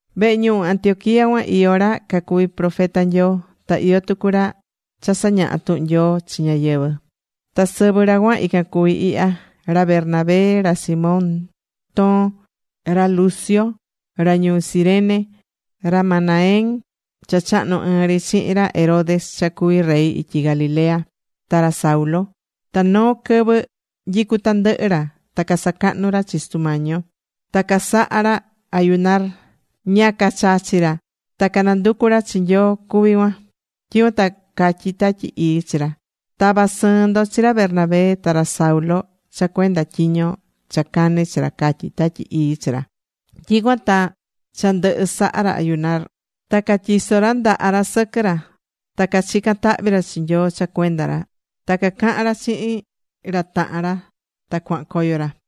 Vehe ñuhu Antioquía cuan iyó ra cacuví profeta Nyoo. Ta iyó tucu ra cha sañahá tuhun Nyoo chi ñáyɨvɨ. Ta sɨvɨ ra cuan ican cuvi ihya: Ra Bernabé, ra Simón Toon, ra Lucio ra ñuu Cirene, ra Manaén cha chahnu̱ ɨɨn ri chihin ra Herodes cha cuví rey ityi Galilea, ta ra Saulo. Ta noo quɨvɨ nyicú tandɨhɨ ra ta casacahnú ra chi Sutu Mañi yo. Ta casahá ra ayunar: ña cachachi ra ta cananducu ra chi Nyoo cuví cuan. Tyicuan ta catyí Tatyi Ii chi ra: ―Ta̱va sɨɨn ndo chi ra Bernabé ta ra Saulo cha cuenda tyiño cha cané chi ra ―catyí Tatyi Ii chi ra. Tyicuan ta cha ndɨhɨ saha ra ayunar, ta catyiso̱ ra ndaha ra sɨquɨ ra, ta cachica̱n tahvi ra chi Nyoo cha cuenda ra. Ta cacahan ra chihin ra tahan ra ta cuaha̱n coyo ra.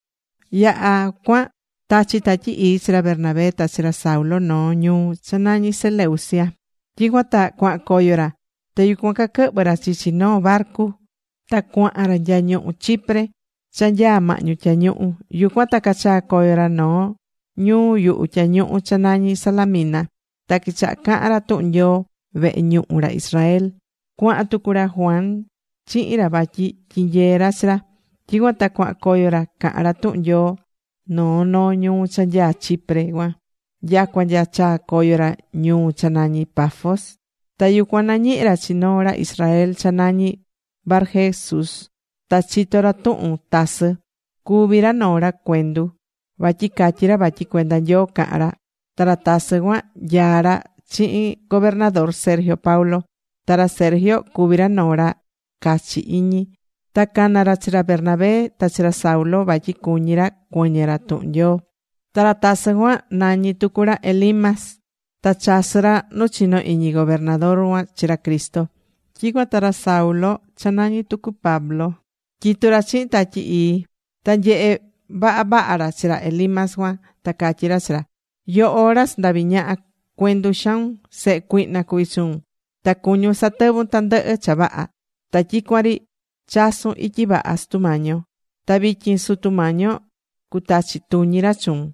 Yaha̱ cuan tachi̱ Tatyi Ii chi ra Bernabé ta chi ra Saulo noo ñuu cha nañí Seleucia. Tyicuan ta cuahan coyo ra. Ta yucuan caquɨhvɨ̱ ra chichi noo barcu ta cuaha̱n ra nya ñuhú Chipre cha nyaa mahñu tyañuhu. Yucuan ta cachaa̱ coyo ra noo ñuu yuhu tyañuhu cha nañí Salamina. Ta quichaha̱ cahan ra tuhun Nyoo vehe ñuhu ra Israel. Cuaha̱n tucu ra Juan chihin ra vatyi tyinyee ra chi ra. Tyicuan ta cuahan coyo ra cahán ra tuhun Nyoo noo noo ñuu cha nyaa Chipre cuan nyacua nya chaa coyo ra ñuu cha nañí Pafos. Ta yucuan nañihi ra chi noo ra Israel cha nañí Barjesús. Ta chitó ra tuhun tasɨ́. Cuví ra noo ra cuendu vatyi catyi ra vatyi cuenda Nyoo cahán ra. Ta ra tasɨ cuan nyaá ra chihin gobernador Sergio Paulo. Ta ra Sergio cuví ra noo ra cachi iñi. Ta cana̱ ra chi ra Bernabé ta chi ra Saulo, vatyi cuñí ra cuɨñɨ ra tuhun Nyoo. Ta ra tasɨ cuan nañí tucu ra Elimas, ta chasɨ́ ra nu chino iñi gobernador cuan chi ra Cristo. Tyicuan ta ra Saulo cha nañí tucu Pablo, tyitú ra chihin Tatyi Ii. Ta nyehe̱ vavaha ra chi ra Elimas cuan. Ta catyí ra chi ra: ―Yoho ra sandaví ñaha, cuendu xaun. Sehe cuihna cuví chuun. Ta cuñún satɨvun tandɨhɨ cha vaha. Ta tyicuan ri chasún ityi vaha Sutu Mañi yo. Ta vityin Sutu Mañi yo cutachi tuñi ra chuun,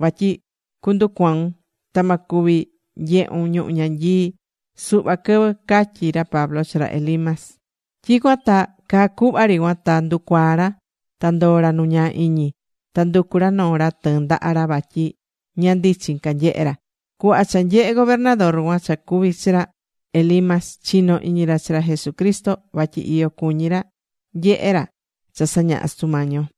vatyi cunducuaun. Ta ma cuvi nyehun ñuhu̱ ñanyii suhva quɨvɨ ―catyí ra Pablo chi ra Elimas. Tyicuan ta caa cuhva ri cuan ta nducuaa̱ ra. Ta ndoo̱ ra nu ñaa iñi. Ta nducu̱ ra noo ra tɨɨn ndaha ra vatyi ña ndichin ca nyehé ra. Cuhva cha nyehe̱ gobernador cuan cha cuvi̱ chi ra Elimas, chino̱ iñi ra chi ra Jesucristo. Vatyi iyo cuñi ra nyehe ra cha sañahá Sutu Mañi yo.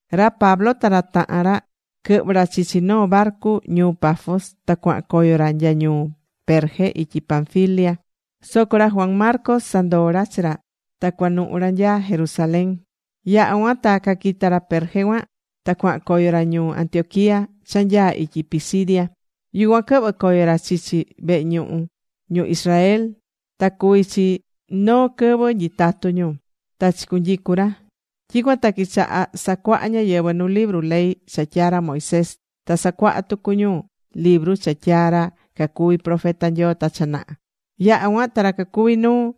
Ra Pablo ta ra tahan ra quɨhvɨ̱ ra chichi noo barcu ñuu Pafos. Ta cuahan coyo ra nya ñuu Perge ityi Panfilia. Soco ra Juan Marcos sandoo̱ ra chi ra ta cuanuhu ra nya Jerusalén. Yaha̱ cuan ta caquita̱ ra Perge cuan, ta cuahan coyo ra ñuu Antioquía cha nyaá ityi Pisidia. Yucuan quɨhvɨ̱ coyo ra chichi vehe ñuhu ñu Israel ta cuví chi noo quɨvɨ nyitatu ñu. Ta chicunyicu̱ ra. Tyicuan ta quichaha̱ sacuaha ñáyɨvɨ nu libru ley cha tyaa̱ ra Moisés. Ta sacuaha̱ tucu ñu libru cha tyaa̱ ra cacuvi profeta Nyoo ta cha naha. Yaha̱ cuan ta ra cacuví nuu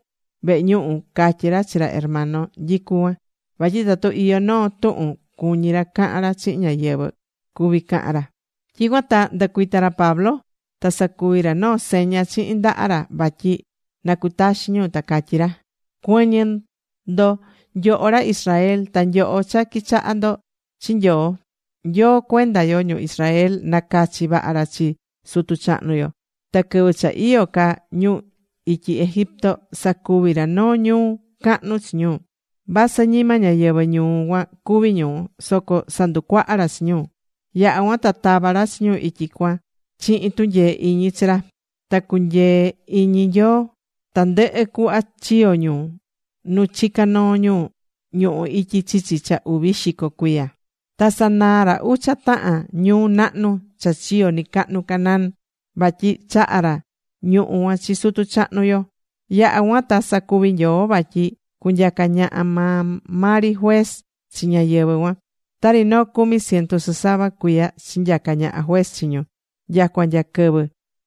vehe ñuhu catyi̱ ra chi ra hermano nyicú cuan, vatyi tatu iyó noo tuhun cuñí ra cahan ra chihin ñáyɨvɨ, cuví cahan ra. Tyicuan ta ndɨcuita̱ ra Pablo ta sacuvi̱ ra noo seña chihin ndaha ra vatyi na cutaxin ñu. Ta catyí ra: ―Cuɨ̱ñɨ ndo nyoho ra Israel, ta nyoho cha quichahá ndo chi Nyoo. Nyoo cuenda yo, ñu Israel, nacachi̱ vaha ra chi sutu chahnu yo. Ta quɨvɨ cha iyó ca ñu ityi Egipto sacuvi̱ ra noo ñuu cahnu chi ñu. Vasɨ ñima ñáyɨvɨ ñuu cuan cuví ñu, soco sanducuaha ra chi ñu. Yaha̱ cuan ta tava̱ ra chi ñu ityi cuan chihin tunyee iñi chi ra. Ta cunyee̱ iñi Nyoo tandɨhɨ cuhva chiyo̱ ñu nu chicá noo ñu ñuhú ityi chichi cha uvi xico cuiya. Ta sanaa̱ ra ucha tahan ñuu nahnu cha chiyo̱ nɨcahnu Canaán, vatyi chaha̱ ra ñuhú cuan chi sutu chahnu yo. Yaha̱ cuan ta sacuvi̱ Nyoo vatyi cunyaca ñaha maa maa ri juez chi ñáyɨvɨ cuan. Tari noo cumi ciento sɨsava cuiya chinyaca̱ ñaha juez chi ñu nyacua nya quɨvɨ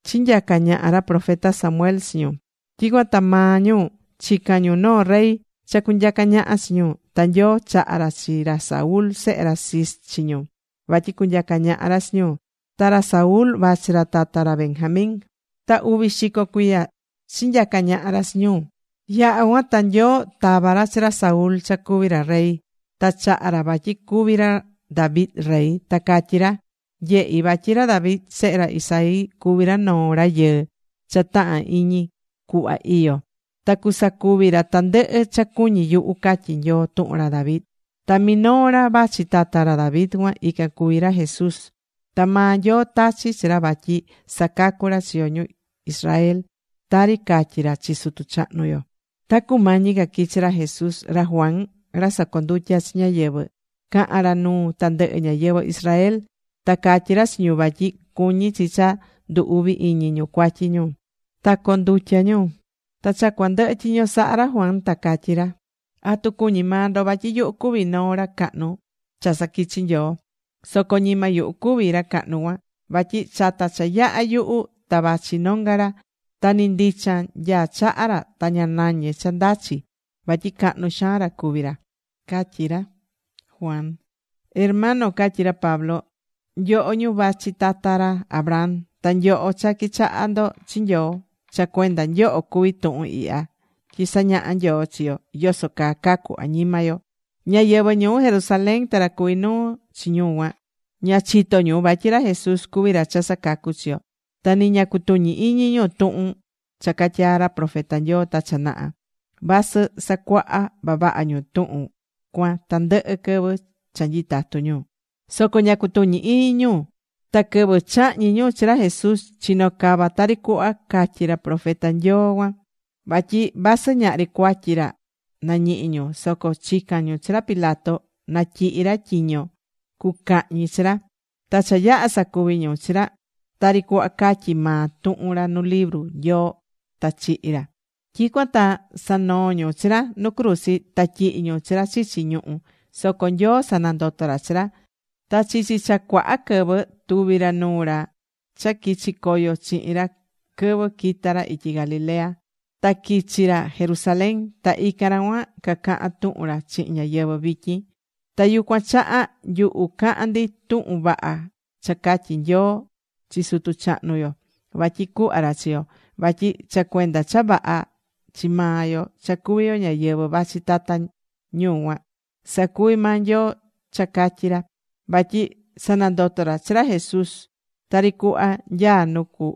chinyaca̱ ñaha ra profeta Samuel chi ñu. Tyicuan ta maa ñu chica̱n ñu noo rey cha cunyaca ñaha chi ñu. Ta Nyoo chaha̱ ra chi ra Saúl sehe ra Cis chi ñu, vatyi cunyaca ñaha ra chi ñu. Ta ra Saúl vachi ra tata ra Benjamín. Ta uvi xico cuiya chinyaca̱ ñaha ra chi ñu. Yaha̱ cuan ta Nyoo tava̱ ra chi ra Saúl cha cuví ra rey. Ta chaha̱ ra vatyi cuvi ra David rey. Ta catyí ra: “Nyehí vatyi ra David sehe ra Isaí cuví ra noo rayɨɨ cha tahán iñi cuhva iyó. Ta cusacuvi ra tandɨhɨ cha cuñí yuhu”, catyí Nyoo tuhun ra David. Ta minoo ra vachi tata ra David cuan ican cuví ra Jesús. Ta maa Nyoo tachi̱ chi ra vatyi sacacu ra chi yo ñu Israel, tari catyi̱ ra chi sutu chahnu yo. Ta cumañi ca quichi ra Jesús, ra Juan ra sacondutya chi ñáyɨvɨ caha̱n ra nuu tandɨhɨ ñáyɨvɨ Israel. Ta catyí ra chi ñu vatyi cuñí chi cha ndu uvi iñi ñu cuatyi ñu, ta condutya ñu. Ta cha cuandɨhɨ tyiño saha ra Juan ta catyí ra: “¿Atu cuñí maa ndo vatyi yuhu cuví noo ra cahnu cha saquichi̱ Nyoo? Soco ñima yuhu cuví ra cahnu cuan. Vatyi chata cha yaha̱ yuhu ta vachi nonga ra. Ta ni ndichan nyaá chaha ra ta ña nañé cha ndachi. Vatyi cahnu xaan ra cuvi ra”, catyí ra Juan. ’Hermano ―catyi ra Pablo― nyoho ñu vachi tata ra Abraham, ta nyoho cha quichahá ndo chi Nyoo. Cha cuenda nyoho cuví tuhun ihya tyi sañahá Nyoo chi yo yoso caa cacu añima yo. Ñáyɨvɨ ñuu Jerusalén ta ra cuví nuu chi ñu cuan, ña chitó ñu vatyi ra Jesús cuví ra cha sacacú chi yo. Ta ni ña cutuñí iñi ñu tuhun cha catyaa̱ ra profeta Nyoo ta cha naha, vasɨ sacuaha vavaha ñu tuhun cuan tandɨhɨ quɨvɨ cha nyitatu ñu, soco ña cutuñi̱ iñi ñu. Ta quɨvɨ chahñi̱ ñu chi ra Jesús chino̱ cava tari cuhva catyi̱ ra profeta Nyoo cuan. Vatyi vasɨ ñahri cuatyi ra nañihi̱ ñu, soco chica̱n ñu chi ra Pilato na tyihi ra tyiño cucahñi chi ra. Ta cha yaha̱ sacuvi̱ ñu chi ra tari cuhva catyí maa tuhun ra nu libru Nyoo ta chihi̱ ra. Tyicuan ta sanoo̱ ñu chi ra nu cruzi. Ta tyihi̱ ñu chi ra chichi ñuhú. Soco Nyoo sanandoto̱ ra chi ra. Ta chichi cha cuaha quɨvɨ tuvi̱ ra nuu ra cha quichi coyo chihin ra quɨvɨ quita̱ ra ityi Galilea, ta quichi ra Jerusalén. Ta ican ra cuan cacahán tuhun ra chihin ñáyɨvɨ vityin. Ta yucuan chaha nyuhu cahán ndi tuhun vaha cha catyi̱ Nyoo chi sutu chahnu yo vatyi cuhva ra chi yo. Vatyi cha cuenda cha vaha chi maa yo cha cuví yo ñáyɨvɨ vachi tata ñu cuan, sacuvi̱ maa Nyoo cha catyi̱ ra. Vatyi sanandoto̱ ra chi ra Jesús tari cuhva nyaá nu cu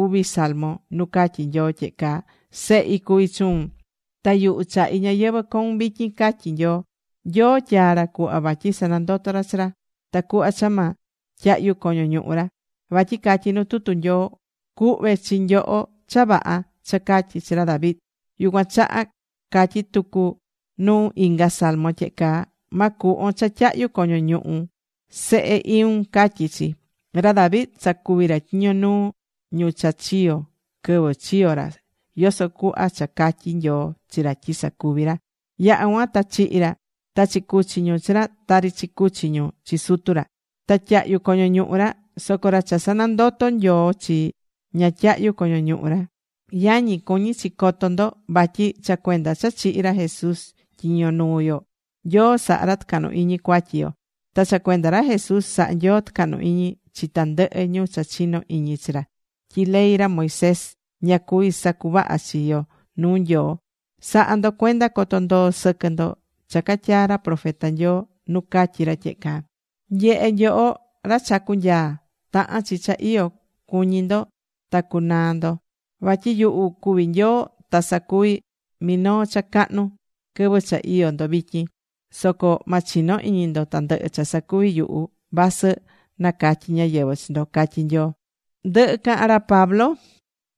uvi salmo nu catyí Nyoo tyehe caa: “Sehi cuví chuun, ta yuhu chahí ñayɨvɨ̱ coun vityin”, catyi Nyoo. Nyoo tyaa̱ ra cuhva vatyi sanandoto ra chi ra, tacuhva cha ma tyahyu coño ñuhu ra. Vatyi catyí nu tutu Nyoo: “Cuhve chi nyoho cha vaha cha catyi̱ chi ra David.” Yucuan chaha catyí tucu nu inga salmo tyehe caa. “Ma cuhvon cha tyahyu coño ñuhu Sehe iun”, catyí chi. Ra David sacuvi̱ ra tyiño nuu ñu cha chiyo̱ quɨvɨ chiyo̱ ra, yoso cuhva cha catyi̱ Nyoo chi ra tyi sacuvi ra. Yaha̱ cuan ta chihi̱ ra ta chicuchi̱ ñu chi ra tari chicuchi̱ ñu chi sutu ra. Ta tyahyu̱ coño ñuhu ra. Soco ra cha sanandoto̱ Nyoo chi, ña tyahyu̱ coño ñuhu ra. Yañi, cuñí chi coto ndo vatyi cha cuenda cha chihi̱ ra Jesús tyiño nuu yo, Nyoo sahá ra tɨcahnu iñi cuatyi yo. Ta cha cuenda ra Jesús sahá Nyoo tɨcahnu iñi chi tandɨhɨ ñu cha chinó iñi chi ra, tyi ley ra Moisés ña cuví sacuvaha chi yo nuu Nyoo. Sa̱ha ndo cuenda coto ndoo sɨquɨ ndo cha catyaa̱ ra profeta Nyoo nu catyi ra tyehe caa: Nye̱he nyoho, ra chacú nyaa, tahán chi cha iyo cuñi ndo ta cunaa ndo. Vatyi yuhu cuví Nyoo, ta sacuví minoo cha cahnu quɨvɨ cha iyó ndo vityin. Soco ma chino iñi ndo tandɨhɨ cha sacuví yuhu vasɨ nacatyi ñáyɨvɨ chi ndo, catyí Nyoo. Ndɨhɨ̱ cahan ra Pablo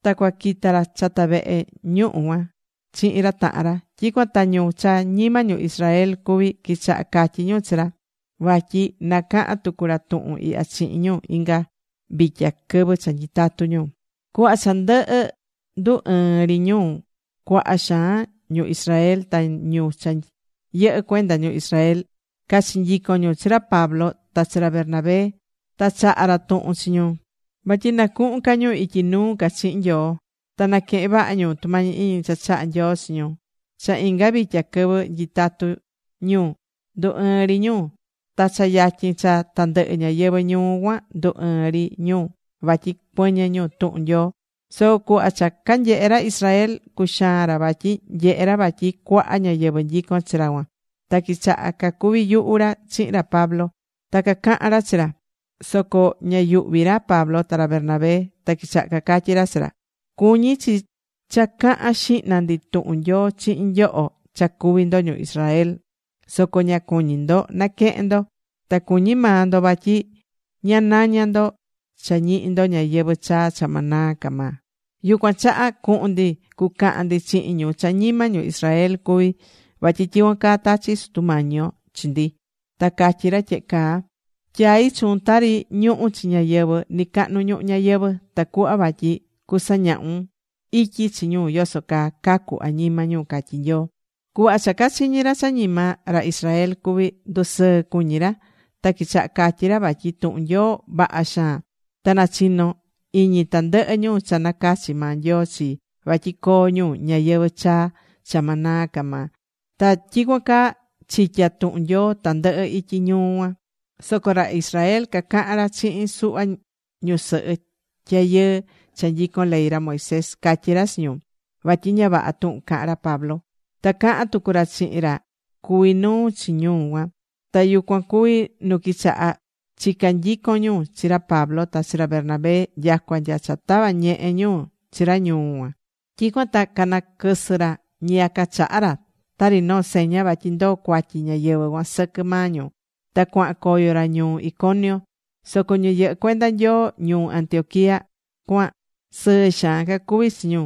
ta cuaquita ra chata vehe ñuhu cuan chihin ra tahan ra. Tyicuan ta ñu cha ñima ñu Israel cuví quichaha catyi ñu chi ra, vatyi na cahan tucu ra tuhun ihya chihin ñu inga vitya quɨvɨ cha nyitatú ñu. Cuhva cha ndɨhɨ ndu ɨɨn ri ñu, cuaha xaan ñu Israel ta ñu cha yɨhɨ́ cuenda ñu Israel, cachinyicon ñu chi ra Pablo ta chi ra Bernabé. Ta chaha̱ ra tuhun chi ñu vatyi na cuhun ca ñu ityi nuu ca chihin Nyoo. Ta na̱quehen vaha ñu tumañi iñi cha chahá Nyoo chi ñu. Cha inga vitya quɨvɨ nyitatu ñu, ndu ɨɨ̱n ri ñu. Ta cha yatyin cha tandɨhɨ ñáyɨvɨ ñuu cuan ndu ɨɨ̱n ri ñu vatyi cuɨñɨ ñu tuhun Nyoo. Soco cuhva cha canyehe ra Israel, cuxaan ra vatyi nyehe ra vatyi cuaha ñáyɨvɨ nyicón chi ra cuan. Ta quichaha cacuvi yuhu ra chihin ra Pablo, ta cacaha̱n ra chi ra. Soco ña yuhví ra Pablo ta ra Bernabé. Ta quichaha cacatyí ra chi ra: ―Cuñi̱ chi cha cahan xihna ndi tuhun Nyoo chihin nyoho cha cuví ndo ñu Israel. Soco ña cuñí ndo naquehen ndo. Ta cuñí maa ndo vatyi ña naña ndo cha ñihi ndo ñayɨvɨ̱ chaa cha ma naa ca maa. Yucuan chaha cuhun ndi cucahan ndi chihin ñu cha ñima ñu Israel cuví. Vatyi tyicuan caa tachí Sutu Mañi yo chi ndi ta catyí ra tyehe caa: Tyai̱ chuun tari ñuhu̱ chi ñáyɨvɨ nɨcahnu ñuhu ñayɨvɨ̱. Tacuhva vatyi cusañahun ityi chi ñu yoso caa cacu añima ñu, catyí Nyoo. Cuhva cha cachiñi̱ ra cha ñima ra Israel cuví, ndusɨɨ̱ cuñi ra. Ta quichaha catyí ra vatyi tuhun Nyoo vaha xaan. Ta nachino̱ iñi tandɨhɨ ñu cha nacachi̱ maa Nyoo chii, vatyi coo ñu ñayɨvɨ̱ chaa cha ma naa ca maa. Ta tyicuan caa chitya̱ tuhun Nyoo tandɨhɨ ityi ñuu cuan. Soco ra Israel cacaha̱n ra chihin suhva ñusɨhɨ tyayɨɨ cha nyicón ley ra Moisés. Catyí ra chi ñu vatyi ña vaha tuhun cahán ra Pablo. Ta cahán tucu ra chihin ra cuví nuu chi ñuu cuan. Ta yucuan cuvi nu quichaha̱ chica nyicon ñu chi ra Pablo ta chi ra Bernabé, nyacua nya cha tava̱ ñehe ñu chi ra ñuu cuan. Tyicuan ta canaquɨsɨ ra ñiyaca chaha ra tari noo seña vatyi ndoo cuatyi ñáyɨvɨ cuan sɨquɨ maa ñu. Ta cuahan coyo ra ñuu Iconio. Soco ñu yɨhɨ cuenda Nyoo ñuu Antioquía cuan sɨɨ xaan cacuví chi ñu.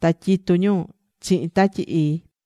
Ta tyitu ñu chihin Tatyi Ii.